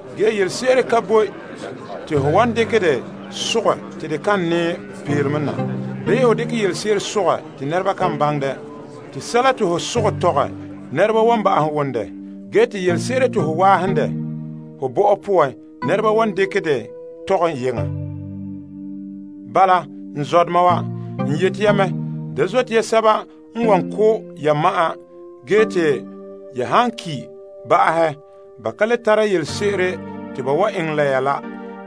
Ge yelese'ere ka boe te ho wan dekɛ dɛ sogɛ te de kan nɛɛ peelome na, bii ho dekɛ yelese'ere n sogɛ te nɛreba kan baŋɛ dɛ. Te sɛla te ho sogɛ tɔgɛ nɛreba wan ba'ahom wom dɛ. Ge te yelese'ere te ho waahom dɛ ho bɔ'ɔ poan nɛreba wan dekɛ dɛ tɔgɛ yeŋa. Bala, n zɔdoma wa, n yete ya mɛ, da zote ya sɛba n wan ko' ya ma'an ge te ya han ki' ba'ahɛ ba ka le tare yelese'ere te ba eŋɛ la ya la.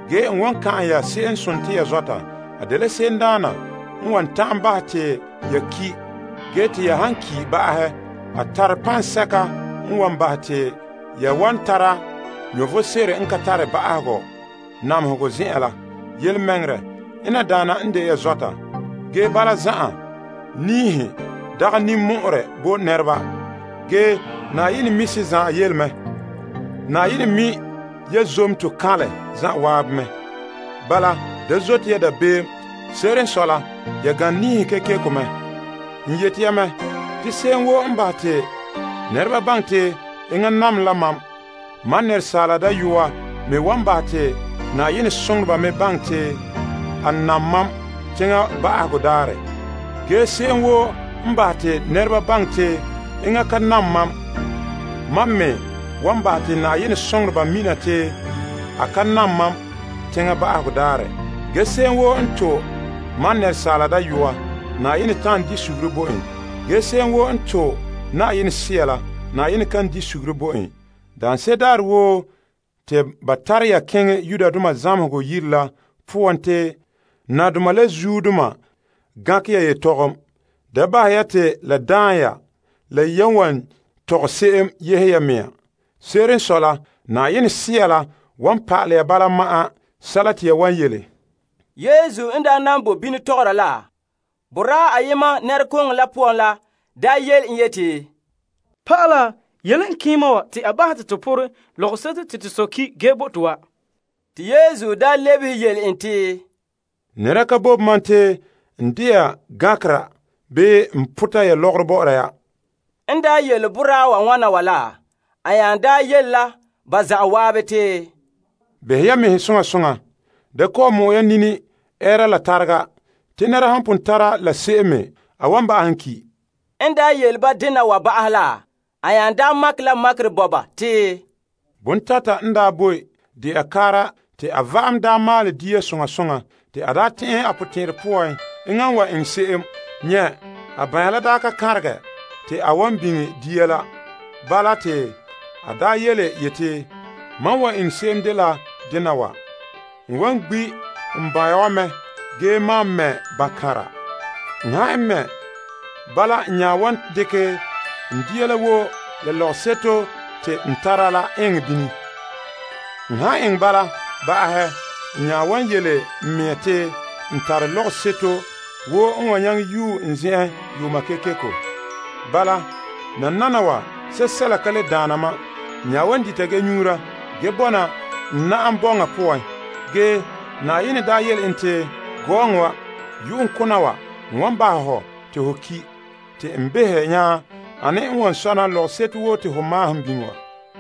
Ge n wan kan'an ya se'em n sontii ya zɔta. A dela se'emdaana n wan ta'an bahɛ te ya ki', ge te ya han ki' ba'ahɛ a tare paŋsɛka n wan dekɛ ya bahɛ namehegɔseko n ka tare ba'ahegɔ poan. Yelemɛŋɛrɛ, ena daana n de ya zɔta. Ge bala zan'an, niihe dagɛ ninmɔ'ɔrɛ bo nɛreba, ge Na'ayenɛ mi' se zan'an yele. Ge Na'ayenɛ mi' ya zonto kaanlɛ zan'an mɛ. Bala da zote ya dabeem. Se'ere n sɔe la, ya gane niihe kekeko mɛ. N yete ya mɛ, te se'em woo n bahɛ te nɛreba baŋɛ te enŋa nam la mam, Asaala Dayɔa me wan bahɛ te Na'ayenɛ soŋoreba me baŋɛ te a nam mam teŋa ba'ahegɔ daarɛ. Ge se'em woo n bahɛ te nɛreba baŋɛ te enŋa ka nam mam, mam me wan bahɛ te Na'ayenɛ soŋoreba mina te a ka nam mam teŋa ba'ahegɔ daarɛ. Ge se'em woo n to' Asaala Dayɔa, Na'ayenɛ ta'an bahɛ a be'em bo en. Ge se'em woo n to' Yenɛ Sea la, Na'ayenɛ kan bahɛ a be'em bo en. Daanse'ere daarɛ woo te ba tare ya keŋɛ zamehegɔ yire la poan te nadoma la zuodoma ya yetɔgom, da bahɛ ya te la daan ya la ya wan tɔgɛ se'em yehe ya mea. Se'ere n sɔe la, Yenɛ Sea la wan pa'alɛ ya bala ma'an sɛla te ya wan yele. Yesu n daa nan boe bini tɔgɔra la, boraa ayema nɛrekooŋɔ la poan la yele en yeti, Pa'ala, yele n keema wa te a bahɛ te to porɛ lɔgɔseto te to sɔ ki' ge bo to wa. Te Yesu lebehe yele en te, Nɛra ka bobe mam te n de'a gankera bii n pota ya lɔgɔrɔ bɔ'ɔra ya. En daa yele boraa wa wana wa la, a nya yele la ba zan'an te, Behe ya mɛhe soŋa soŋa. Da kɔ'ɔn mɔ'ɛ ya nini ɛɛra la tarega. Te nɛra han pon tara la se'em me a wan ba'ahom ki'. A bo ba la makerɛ te, Bontata n daa boe de'a kaara te a va'am daa maalɛ dia. Te a tɛn'ɛhe a potɛn'ɛrɛ poan, enŋa n wan eŋɛ se'em, nyɛ' a banya la daa ka kanregɛ te a wan biŋe dia la. Bala te a yeti, Mam wa eŋɛ se'em dela dena wa, n wa gbi' n banya wa mɛ ge maan mɛ bankanra. N han mɛ' bala n nya wan dekɛ n dia la woo la lɔgɔseto te n tara la eŋɛ bini. N han eŋɛ bala ba'ahɛ, n nya wan yele n mea te n tare lɔgɔseto woo n wan yue n zen'en yuuma kekeko. Bala nananawa sɛla ka le daana mam. N nya wan dita ge nyuura ge bɔna n na'am bɔŋa poan. Ge Na'ayenɛ yele en te, Gɔɔŋɔ wa, yu'uŋkona wa n wan bahɛ hɔ te ho ki' te n behɛ nya ane n wan sɔna lɔgɔseto woo te ho maahom biŋe wa?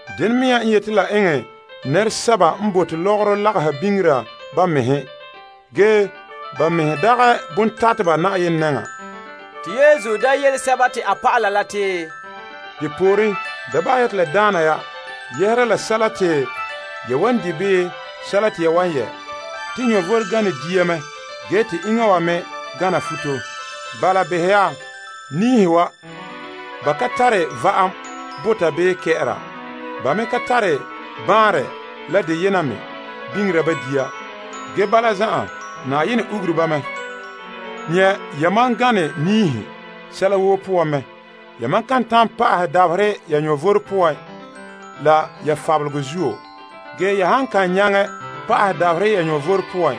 Dena mea n yete la eŋɛ nɛresɛba n bote lɔgɔrɔ lagaha biŋera ba mɛhe. Ge ba mɛhe dagɛ bontateba Na'ayenɛ nɛŋa. Te Yesu nya yele a dɔlɔba la te, Depooren, da bahɛ ya te la daana ya yɛhera la sɛla te ya wan di' bii sɛla te ya wan yɛ'. Te vom gane dia mɛ ge te iŋa wa me gana futo. Bala behɛ ya niihe wa. Ba ka tare va'am bota bii kɛ'ɛra. Ba me ka tare baanrɛ la deyena me biŋera ba dia. Ge bala zan'an, Na'ayenɛ ugure ba mɛ. Behe ya, yamam gane niihe sɛla woo poan mɛ. Yamam kan ta'an pa'ahɛ dabaherɛ ya vom poan ge la ya fabelegɔ zuo. Ge ya han kan nyaŋɛ pa'ahɛ dabaherɛ ya vom poan,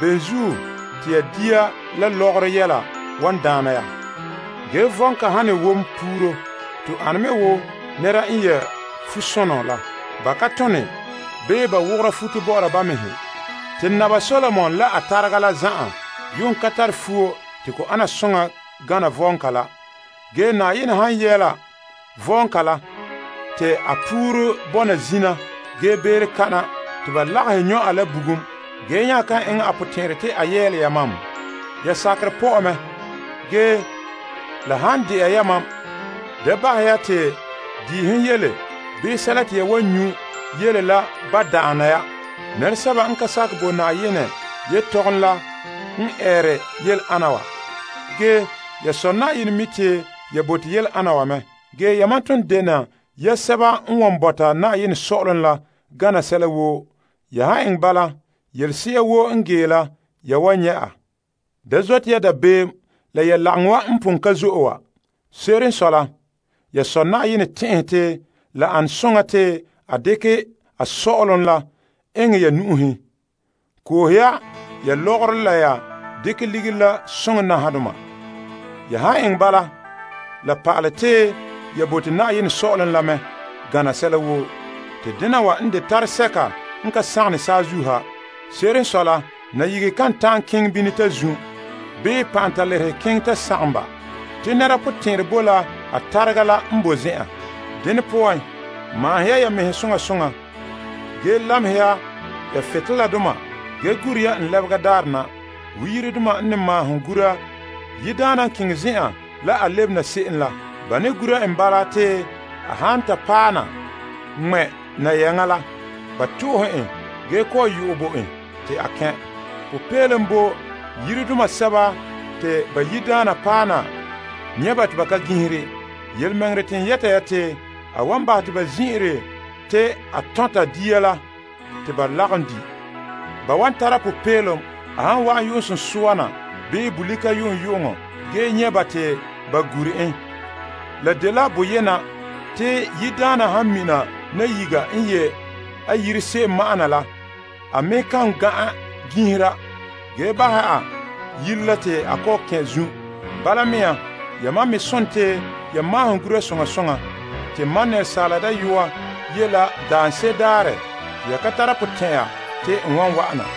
bene zuo te dia la lɔgɔrɔ yɛla wan daana ya? Ge vɔɔnka han ne wom puru to ane me wo nɛra n yɛ' fusoŋɔ la. Ba ka tone bii ba wogora futo bɔ'ɔra ba mɛhe. Te ge Naba Solomon la a tarega la zan'an yuun ka tare fuo te ko ana soŋa gana vɔɔnka la. Ge Na'ayenɛ han yɛɛla vɔɔnka la te a puru bɔna zina ge beere kana te ba lagahɛ nyɔ' a la bugum, ge nya kan eŋɛ a potɛn'ɛrɛ te a yɛɛlɛ yamam? Ya sakerɛ pɔ'ɛ mɛ. Ge la han dɛna yamam, da bahɛ ya te diihom yele bii sɛla te ya wan nyu' yele la ba' daana ya. Nɛresɛba n ka sakɛ bo Na'ayenɛ yelehom la n eere yele ana wa. Ge ya Sɔ' Na'ayenɛ mi' te ya bote yele ana wa mɛ. Yamam toon dene ya sɛba n wan bɔta Na'ayenɛ Sɔ'ɔlom la gana sɛla woo. Ya han eŋɛ bala, yelese'a woo n gee la ya wan nyɛ' a. Da zote ya dabeem la ya lagaŋɔ wa n pon ka zo'e wa. Se'ere n sɔe la, ya Sɔ' Na'ayenɛ tɛn'ɛhɛ te la ana soŋa te a dekɛ a Sɔ'ɔlom la eŋɛ ya nu'uhen. Koohe ya, ya lɔgɔrɔ la ya dekɛ ligiri la soŋɛ nahadoma. Ya han eŋɛ bala, la pa'ale te ya bote Na'ayenɛ Sɔ'ɔlom la mɛ gana sɛla woo. Te dena wa n de tare sɛka n ka sagom saazuo ha. Se'ere n sɔe la, nayigehe kan ta'an keŋɛ bini ta zun' bii pantalerehe keŋɛ ta sagom ba. Te nɛra potɛn'ɛrɛ boe la a tarega la n boe zen'an. Dene poan maahom ya ya mɛhe soŋa soŋa ge lamehɛ ya butoleladoma, ge gura ya n lebega daarɛ na wo yiredoma n ne maahom gura yiredaana n keŋɛ zen'an la a lebena se'em la. Ba ne gura en bala te a han paɛ na ŋmɛ' nayaŋa la, ba to'ohe en ge kɔ'ɔn yo'ɛ bo en te a kɛn'. Popeelom bo yiredoma sɛba te ba yiredaana paɛ na nyɛ' ba te ba ka gin'ihe. Yelemɛŋɛrɛ te n yɛta ya te a wan bahɛ te ba zin'ire te a tɔnta dia la te ba lagom di'. Ge ba wan tara popeelom a han wa'an yu'uŋsunsua na bii bolika yu'uŋyu'uŋɔ ge nyɛ' ba te ba gure en. La dela boyena te yiredaana han mina nayiga n ye' a yire se'em ma'an na la, a me kan gan'an gin'ihera ge bahɛ a yire la te a kɔ' kɛn' zun'. Bala mea yamam me sontii ya maahom gura soŋa soŋa. Te Asaala Dayɔa ye' la daanse'ere daarɛ te ya ka tara potɛn'ɛra te n wan wa'ana.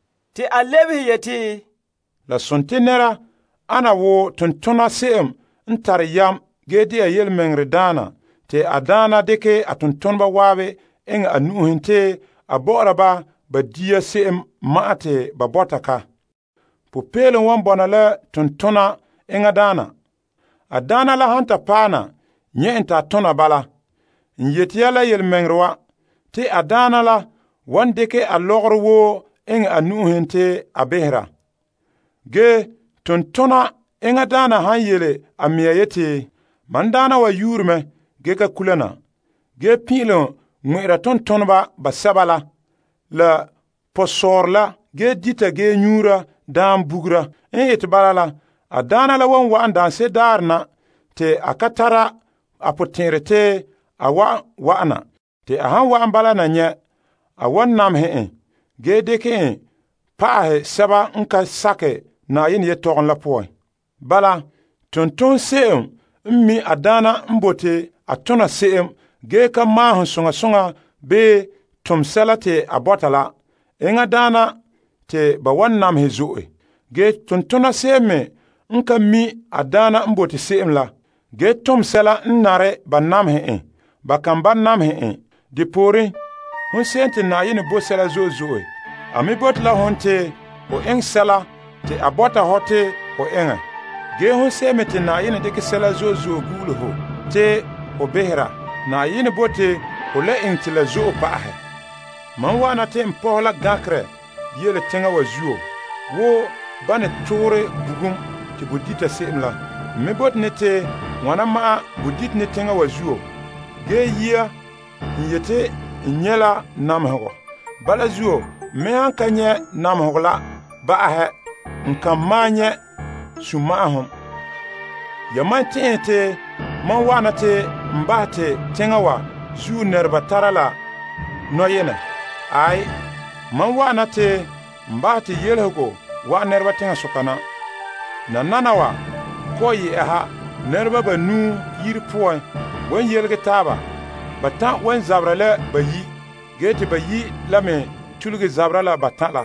Te a lebehe yeti, La sontii nɛra ana wo tontona se'em n tare yam ge dɛna yelemɛŋɛrɛdaana te a daana dekɛ a tontoneba zan'an eŋɛ a nu'uhen te a bɔ'ɔra ba ba dia se'em ma'an te ba bɔta ka. Popeelom wan bɔna la tontona enŋa daana, a daana la han ta paɛ na nyɛ' en te a tona bala. N yete ya la yelemɛŋɛrɛ wa, te a daana la wan dekɛ a lɔgɔrɔ woo eŋɛ a nu'uhen te a behera. Ge tontona enŋa daana han yele a mɛŋa yeti, Mam daana wa yuure mɛ ge ka kula na, ge pin'ilom ŋmɛ'ɛra tontoneba basɛba la la pɔsɔɔrɔ la ge dita ge nyuura daam bugura. En ete bala la, a daana la wan wa'an daanse'ere daarɛ na te a ka tara a potɛn'ɛrɛ te a wan wa'an na. Te a han wa'an bala na nyɛ' en a wan ŋma' en zɔnra zɔnra ge dekɛ en pa'ahɛ sɛba n ka sakɛ Na'ayenɛ yelehom la poan. Bala tontonse'em n mi' a daana n bote a tona se'em ge ka maahom soŋa soŋa bii tom sɛla te a bɔta la, enŋa daana te ba wan namehɛ. Ge tontona se'em me n ka mi' a daana n bote se'em la, ge tom sɛla n ka nare, ba wan namehɛ en ge ba kan ba' namehɛ en. Depooren hon se'em te Na'ayenɛ bo sɛla zo'e zo'e a me bote la hon te ho eŋɛ sɛla te a bɔta hɔ te ho eŋɛ. Ge hon se'em me te Na'ayenɛ dekɛ sɛla zo'e zo'e gu'ule ho te behera, Na'ayenɛ bote ho le eŋɛ te la zo'e pa'ahɛ. Mam wa'ana te n pɔhɛ la gankerɛ yele teŋa wa zuo wo ba ne toorɛ bugum te bo dita se'em la. Tɔ. N me bote ne te wana ma'an bo dite ne teŋa wa zuo. Ge yia n yete n nyɛ' la namehegɔ. Bala zuo n me han ka nyɛ' namehegɔ la ba'ahɛ n ka malom nyɛ' sunma'ahom. Yamam tɛn'ɛhe te mam wa'an na te n bahɛ te teŋa wa zuo nɛreba tara la nɔyenɛ? Aai, mam wa'an na te n bahɛ te yelehego wa'an nɛreba teŋasoka na. Nananawa kɔ'ɔn yɛ'ɛha, nɛreba banuu yire poan wan yelege taaba. Batan' wan zabera la bayi' ge te bayi' la me tuluge zabera la batan' la.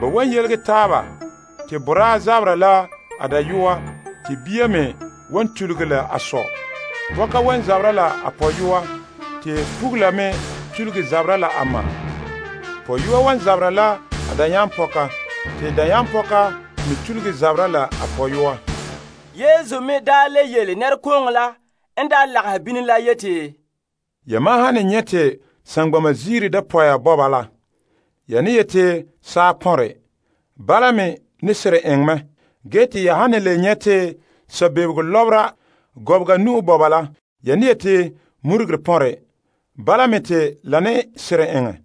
Ba wan yelege taaba te boraa zabera la a dayɔa te bia me wan tuluge la a sɔ. Pɔka wan zabera la a pɔyɔa, te pugula me tuluge zabera la a ma. Pɔyɔa wan zabera la a dayampɔka te dayampɔka me tuluge zabera la a pɔyɔa. Yesu me daa le yele nɛrekooŋɔ n lagahɛ bini la yeti, Yamam han ne nyɛ' te saŋgbana ziira dapɔya bɔba la, ya ne yete saa pɔnre. Bala me ne seren eŋɛ mɛ. Ge te ya han ne le nyɛ' te sabebego lɔbera gɔbega nu'o bɔba la, ya ne yete murugere pɔnre. Bala me te la ne seren eŋɛ.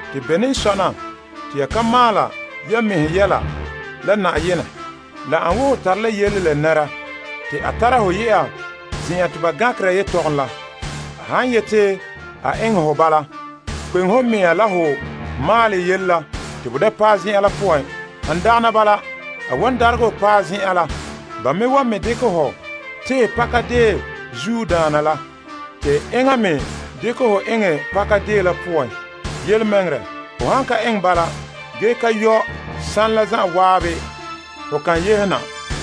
Te bene n le sɔna te ya ka maala ya mɛhe yɛla la Na'ayenɛ? La ane wo ho tare la yele la nɛra te a tara hɔ yɛ'a zen'en te ba gankera yetɔgom la. A han yete a eŋɛ hɔ bala, kpeŋe ho mea la ho maalɛ yele la te bo da paɛ zen'an la poan. Han dagana bala, a wan daregɛ hɔ paɛ zen'an la, ba me wan me dekɛ ho tehɛ pakadeen zuodaana la te enŋa me dekɛ ho eŋɛ pakadeen la poan. Yelemɛŋɛrɛ ho han ka eŋɛ bala, ge ka yɔ' saanɛ la zan'an ho kan yehe na.